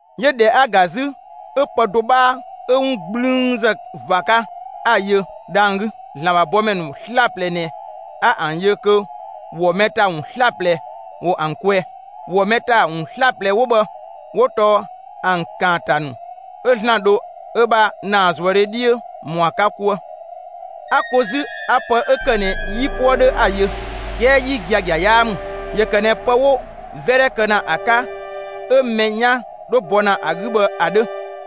'Yö ꞊dhɛ 'a‑ ‑ga 'zü, 'ö pë do 'bhaa 'ö 'wun 'gblüünzë ꞊va 'ka, 'a‑ yö dhang‑ 'gü. ‑Zlan ‑bha bɔmɛ ‑nu 'slaplɛ ꞊nɛ 'a ‑an yö kö ‑wɔ mɛ ‑ta ‑wun 'slaplɛ ‑wo ‑an kwɛɛ. ‑Wɔ mɛ ‑ta ‑wun 'slaplɛ 'wo bhë 'wo tɔɔ ‑an ‑kaanta ‑nu 'ö ‑Zlan dho ö bha ‑naazuëdhe 'dhiö ‑mɔ ‑a 'ka 'kuë. 'A ko 'zü 'a pë 'ö ‑kë ꞊nɛ 'yipuë 'dhö 'a‑ yö. 'Kɛɛ 'yi giagia 'yaa ‑mü. ‑Yö ‑kë ꞊nɛ pë 'wo 'vɛdhɛ kë ‑na ‑a 'ka 'ö mɛ 'yan 'dho bɔ ‑na ‑a 'gü bhë ‑a 'dhö.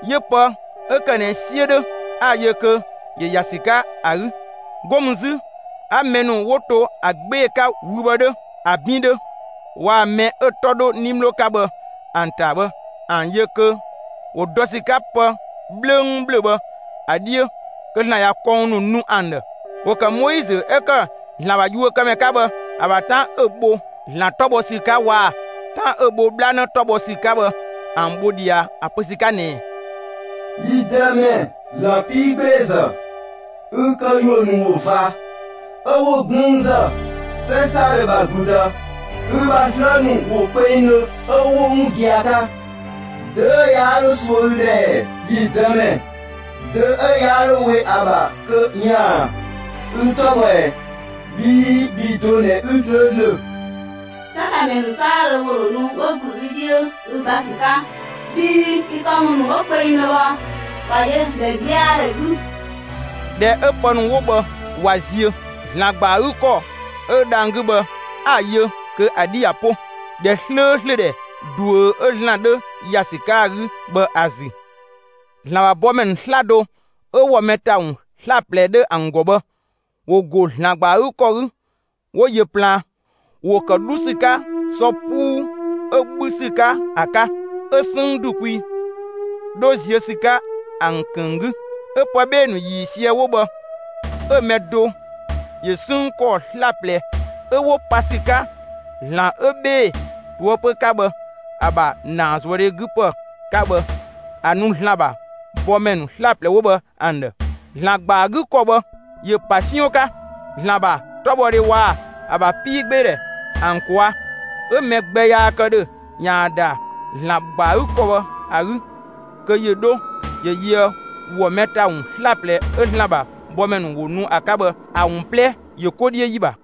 'Yö pë 'ö ‑kë ꞊nɛ 'siö 'dhö 'a‑ yö kö ‑yö ‑ya ‑sü 'ka ‑a 'gü. 'Go mü 'zü 'a mɛ ‑nu 'wo to ‑a 'gbee‑ 'ka wü bhë 'dhö, ‑a 'bin 'dhö, waa‑ mɛ 'ö‑ 'tɔ 'dho 'nimlo 'ka bhë ‑an ‑ta bhë, ‑an yö kö ‑wo dɔ ‑sü 'ka pë 'bhlöngbhlöng bhë ‑a 'dhiö, kö ‑Zlan ꞊ya kɔng ‑nu nu ‑an ‑dhë. ‑Wo ‑kë Moizö 'ö ‑kë ‑Zlan ‑bha yuökëmɛ 'ka bhë ‑a ‑bha 'tan 'ö‑ bho ‑Zlan 'tɔ bhɔ ‑sü 'ka waa‑ 'tan 'ö bho 'bhlanë 'tɔ bhɔ ‑sü 'ka bhë ‑an bho ꞊dhia, ‑a pö ‑sü 'ka ꞊nɛɛ: «Yi Dëmɛ, ‑Zlan 'piigbeezë, ü këyuö ‑nu ꞊wo ꞊va, 'ö 'wo 'gblüünzë; 'sɛ 'saadhö ‑bha ‑gludë, ü ‑bha 'slë ‑nu ꞊wo kpengdhö 'ö 'wo 'wun gia‑ 'ka. Dö 'ö yaa 'dho suö ü ‑dhë ‑ɛ, yi Dëmɛ? Dö 'ö yaa 'dho we ‑a ‑bha kö ‑yaan ü 'tɔ bhɔ ꞊ɛ? Bhii bhi do ꞊nɛ 'ü 'slööslö. 'Sɛtamɛ ‑nu 'saadhö ‑wo ‑dho nu 'wo ‑gblü ü 'dhiö ü gba ‑sü 'ka, bhii ü këwun ‑nu 'wo kpengdhö bhë ꞊wa yö ‑dhɛgbɛadhɛ 'gü.» ꞊Dhɛ 'ö pë ‑nu 'wo bhë ꞊wa ziö, ‑Zlan ‑gba ‑a 'gü ‑kɔ 'ö dhang‑ 'gü bhë, 'a‑ yö kö ‑a 'dhi ꞊ya 'po ‑dhɛ 'slööslö ‑dhɛ ꞊duö 'ö ‑Zlan 'dhö ‑ya ‑sü 'ka ‑a 'gü bhë ‑a ‑zü. ‑Zlan ‑bha bɔmɛ ‑nu 'slaplɛ 'ö ‑wɔ mɛ ‑ta ‑wun 'slaplɛ 'dhö ‑an ‑gɔ bhë, ‑wo ‑go ‑Zlan ‑gba ‑a 'gü ‑kɔ 'gü, 'wo yö plaan; ‑wo ‑kë 'dhu ‑sü 'ka sɔ 'puu 'ö 'bhü ‑sü 'ka ‑a 'ka; 'ö 'sënng ‑du kwi 'dho ziö ‑sü 'ka ‑an ‑kënng 'gü. 'Ö pë 'bhee‑ ‑nu ‑yiisië 'wo bhë 'ö‑ mɛ do ‑yö 'sënng ‑kɔɔ 'slaplɛ 'ö 'wo pa ‑sü 'ka ‑Zlan 'ö 'bhee‑ ꞊toëpö 'ka bhë ‑a ‑bha ‑naazuëdhe 'gü ‑pë 'ka bhë ‑a nu ‑Zlan ‑bha bɔmɛ ‑nu 'slaplɛ 'wo bhë ‑an ‑dhë. ‑Zlan ‑gba ‑a 'gü ‑kɔ bhë ‑yö ‑pa 'siɔn 'ka ‑Zlan ‑bha 'tɔbhɔdhe waa‑ ‑a ‑bha 'piigbeedhɛ ‑an ꞊kwaa'. 'Ö mɛ gbɛ yaa kë ‑dhö ‑yaan ‑da ‑Zlan ‑gba ‑a 'gü ‑kɔ 'ö bhë ‑a 'gü kö ‑yö 'dho ‑yö yöë ‑wɔ mɛ ‑ta ‑wun 'slaplɛ 'ö ‑Zlan ‑bha bɔmɛ ‑nu ‑wo ‑nu ‑a 'ka bhë ‑a ‑wun 'plɛ ‑yö 'ko 'dhiö ‑yi ‑bha.